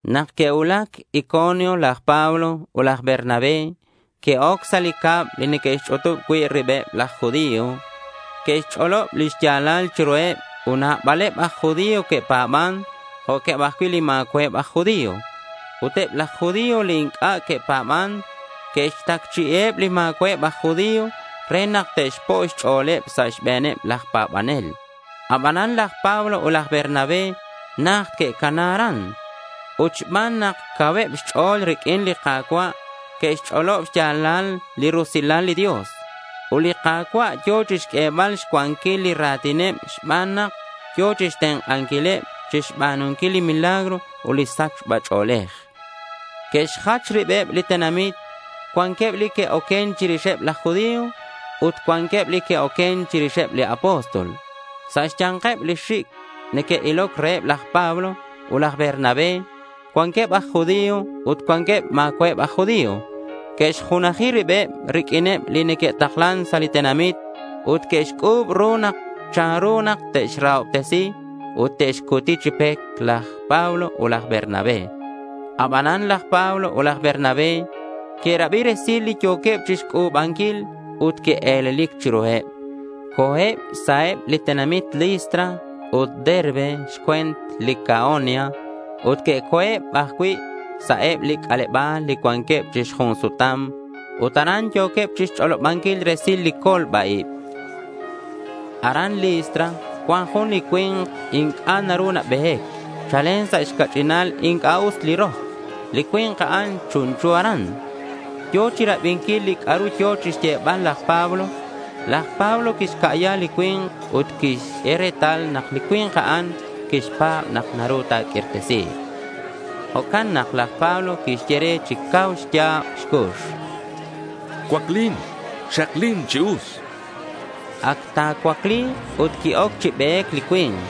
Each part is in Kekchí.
Nak que'cuulac Iconio, laj Pablo ut laj Bernabé que'oc sa' li cab li neque'xch'utub cui' ribeb laj judío. Que'xch'olob li xya̱lal chiruheb ut nabaleb aj judío que'pa̱ban jo'queb ajcui' li ma̱cua'eb aj judío. Ut eb laj judío li inc'a' que'pa̱ban, que'xtacchi'iheb li ma̱cua'eb aj judío re nak te'xpo' xch'o̱leb sa' xbe̱neb laj pa̱banel. Abanan laj Pablo ut laj Bernabé najt que'cana aran. Ut xban nak cauheb xch'o̱l riq'uin li Ka̱cua' que'xch'olob xya̱lal li rusilal li Dios. Ut li Ka̱cua' yo̱ chixq'uebal xcuanquil li ra̱tineb xban nak yo̱ chixtenk'anquileb chixba̱nunquil li milagros ut li sachba ch'o̱lej. Que'xjach ribeb li tenamit. Cuanqueb li que'oquen chirixeb laj judío ut cuanqueb li que'oquen chirixeb li apóstol. Sa' xya̱nkeb li xic' neque'iloc reheb laj Pablo ut laj Bernabé cuanqueb aj judío ut cuanqueb ma̱cua'eb aj judío. Que'xjunaji ribeb riq'uineb li neque'taklan sa' li tenamit ut que'xc'u̱b ru chanru nak te'xrahobtesi ut te'xcuti chi pec laj Pablo ut laj Bernabé. Abanan laj Pablo ut laj Bernabé que'rabi resil li yo̱queb chixc'u̱banquil ut que'e̱lelic chiruheb. Co̱eb sa' eb li tenamit Listra ut Derbe xcue̱nt Licaonia ut que'co̱eb ajcui' sa' eb li c'aleba̱l li cuanqueb chi xjun sutam. Ut aran yo̱queb chixch'olobanquil resil li colba-ib. Aran Listra cuan jun li cui̱nk inc'a' naru nabe̱c. Chalen sa' xca'ch'inal inc'a' us li rok. Li cui̱nk a'an chunchu aran. Yo̱ chirabinquil li c'a'ru yo̱ chixyebal laj Pablo. Laj Pablo quixca'ya li cui̱nk ut quixq'ue retal nak li cui̱nk a'an quixpa̱b nak naru ta̱q'uirtesi̱k. Jo'can nak laj Pablo quixye re chi cau xya̱b xcux: —Cuaclin. Xaklin chi us, chan. Ac ta̱cuacli̱k ut qui-oc chi be̱c li cui̱nk.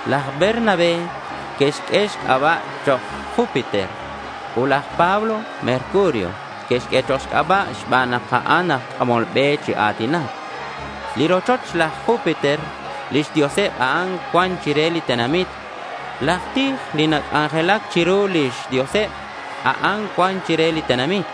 Laj Bernabé que'xq'ue xc'aba' chok' Júpiter, ut laj Pablo Mercurio que'xq'ue chok' xc'aba' xban nak a'an aj c'amol be chi a̱tinac. Li rochoch laj Júpiter lix dioseb a'an cuan chire li tenamit. Laj tij li nac'anjelac chiru lix dioseb a'an cuan chire li tenamit.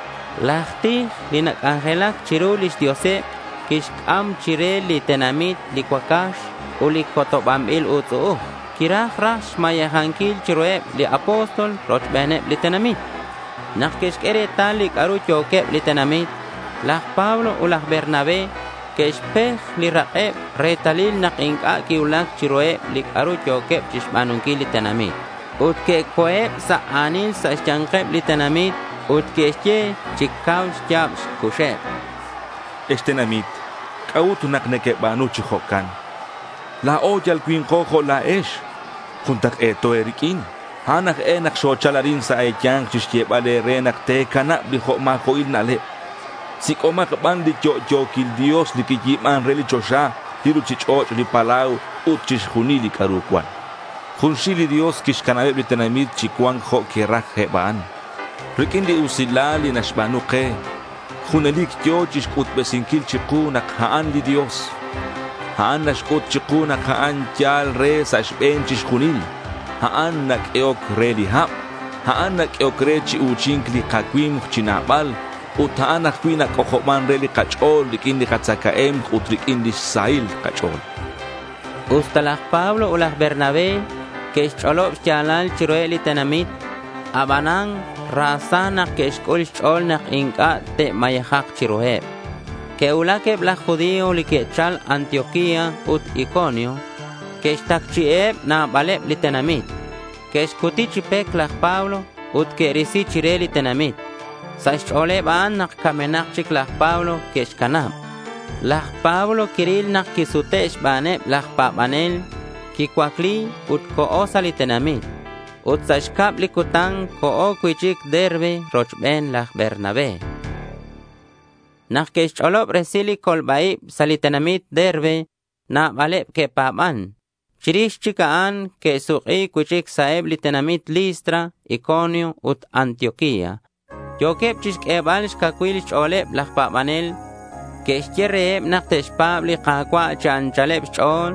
Laj tij li nac'anjelac chiru lix dioseb quixc'am chire li tenamit li cuacax ut li cotobanbil utz'u'uj. Quiraj raj xmayejanquil chiruheb li apóstol rochbeneb li tenamit. Nak que'xq'ue retal li c'a'ru yo̱queb li tenamit, laj Pablo ut laj Bernabé que'xpej li rak'eb retalil nak inc'a' quicuulac chiruheb li c'a'ru yo̱queb chixba̱nunquil li tenamit. Ut que'co̱eb sa' a̱nil sa' xya̱nkeb li tenamit ut que'xye chi cau xya̱b xcuxeb: —Ex tenamit, ¿c'a'ut nak nequeba̱nu chi jo'can? La̱o yal cui̱nko jo' la̱ex. Juntak'e̱to e̱riq'uin. A'an aj e nak xochal arin sa' e̱ya̱nk chixyebal e̱re nak te̱canab li jo' ma̱jo'il na'leb. Sic'omak ban li yo'yo̱quil Dios li quiyi̱ban re li choxa, li ruchich'och', li palau ut chixjunil li c'a'ru cuan. Junxil li Dios quixcanabeb li tenamit chi cua̱nc jo' que'raj eb a'an. Riq'uin li usilal li naxba̱nu ke, junelic yo̱ chixc'utbesinquil chiku nak a'an li Dios. A'an naxc'ut chiku nak a'an yal re sa' xbe̱n chixjunil. A'an naq'uehoc re li hab. A'an naq'uehoc re chi u̱chi̱nc li kacui̱mk chi nabal, ut a'an ajcui' nac'ojoban re li kach'o̱l riq'uin li katzacae̱mk ut riq'uin lix sahil kach'o̱l, chan laj Pablo. Usta laj Pablo ut laj Bernabé que'xch'olob xya̱lal chiruheb li tenamit, abanan ra sa nak que'xc'ul xch'o̱l nak inc'a' te'mayejak chiruheb. Que'cuulac eb laj judío li que'chal Antioquía ut Iconio. Que'xtacchi'iheb nabaleb li tenamit. Que'xcuti chi pec laj Pablo ut que'risi chire li tenamit. Sa' xch'o̱leb a'an nak camenak chic laj Pablo que'xcanab. Laj Pablo quiril nak quisute' xbaneb laj pa̱banel. Quicuacli ut co̱ sa' li tenamit. Ut sa' xcab li cutan co̱ cui'chic Derbe rochben laj Bernabé. Nak que'xch'olob resil li colba-ib sa' li tenamit Derbe, nabaleb que'pa̱ban. Chirix chic a'an que'suk'i cui'chic sa' eb li tenamit Listra, Iconio ut Antioquía. Yo̱queb chixq'uebal xcacuil xch'o̱leb laj pa̱banel. Que'xye reheb nak te'xpa̱b li Ka̱cua' chi anchaleb xch'o̱l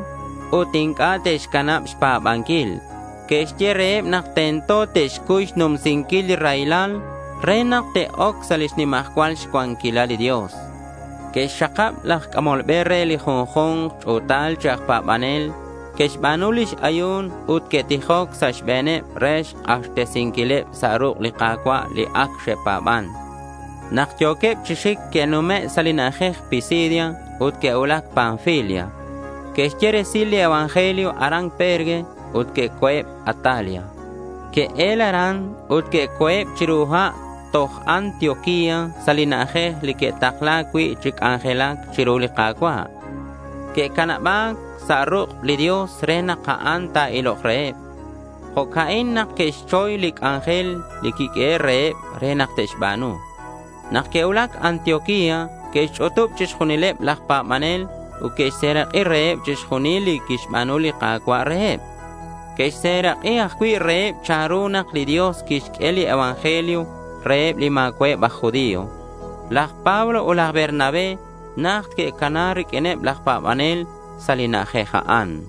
ut inc'a' te'xcanab xpa̱banquil. Que'xye reheb nak tento te'xcuy xnumsinquil li raylal re nak te'oc sa' lix nimajcual cuanquilal li Dios. Que'xxakab aj c'amol be re li junju̱nk ch'u̱tal chi aj pa̱banel. Que'xba̱nu lix ayu̱n ut que'tijoc sa' xbe̱neb re xk'axtesinquileb sa' ruk' li Ka̱cua' li ac xe'pa̱ban. Nak yo̱queb chi xic que'nume' sa' li na'ajej Pisidia ut que'cuulac Panfilia. Que'xye resil li evangelio aran Perge ut que'co̱eb Atalia. Que'el aran ut que'co̱eb chiru ha' toj Antioquía sa' li na'ajej li que'takla̱c cui' chi c'anjelac chiru li Ka̱cua'. Que'canaba̱c sa' ruk' li Dios re nak a'an ta̱ilok reheb. Jo'ca'in nak que'xchoy li c'anjel li quiq'uehe' reheb re te'xba̱nu. Nak que'cuulac Antioquía que'xch'utub chixjunileb laj pa̱banel ut que'xserak'i reheb chixjunil li quixba̱nu li Ka̱cua' reheb. Que'xserak'i ajcui' reheb chanru nak li Dios quixq'ue li evangelio reheb li ma̱cua'eb aj judío. Laj Pablo ut laj Bernabé najt que'cana riq'uineb laj pa̱banel sa' li na'ajej a'an.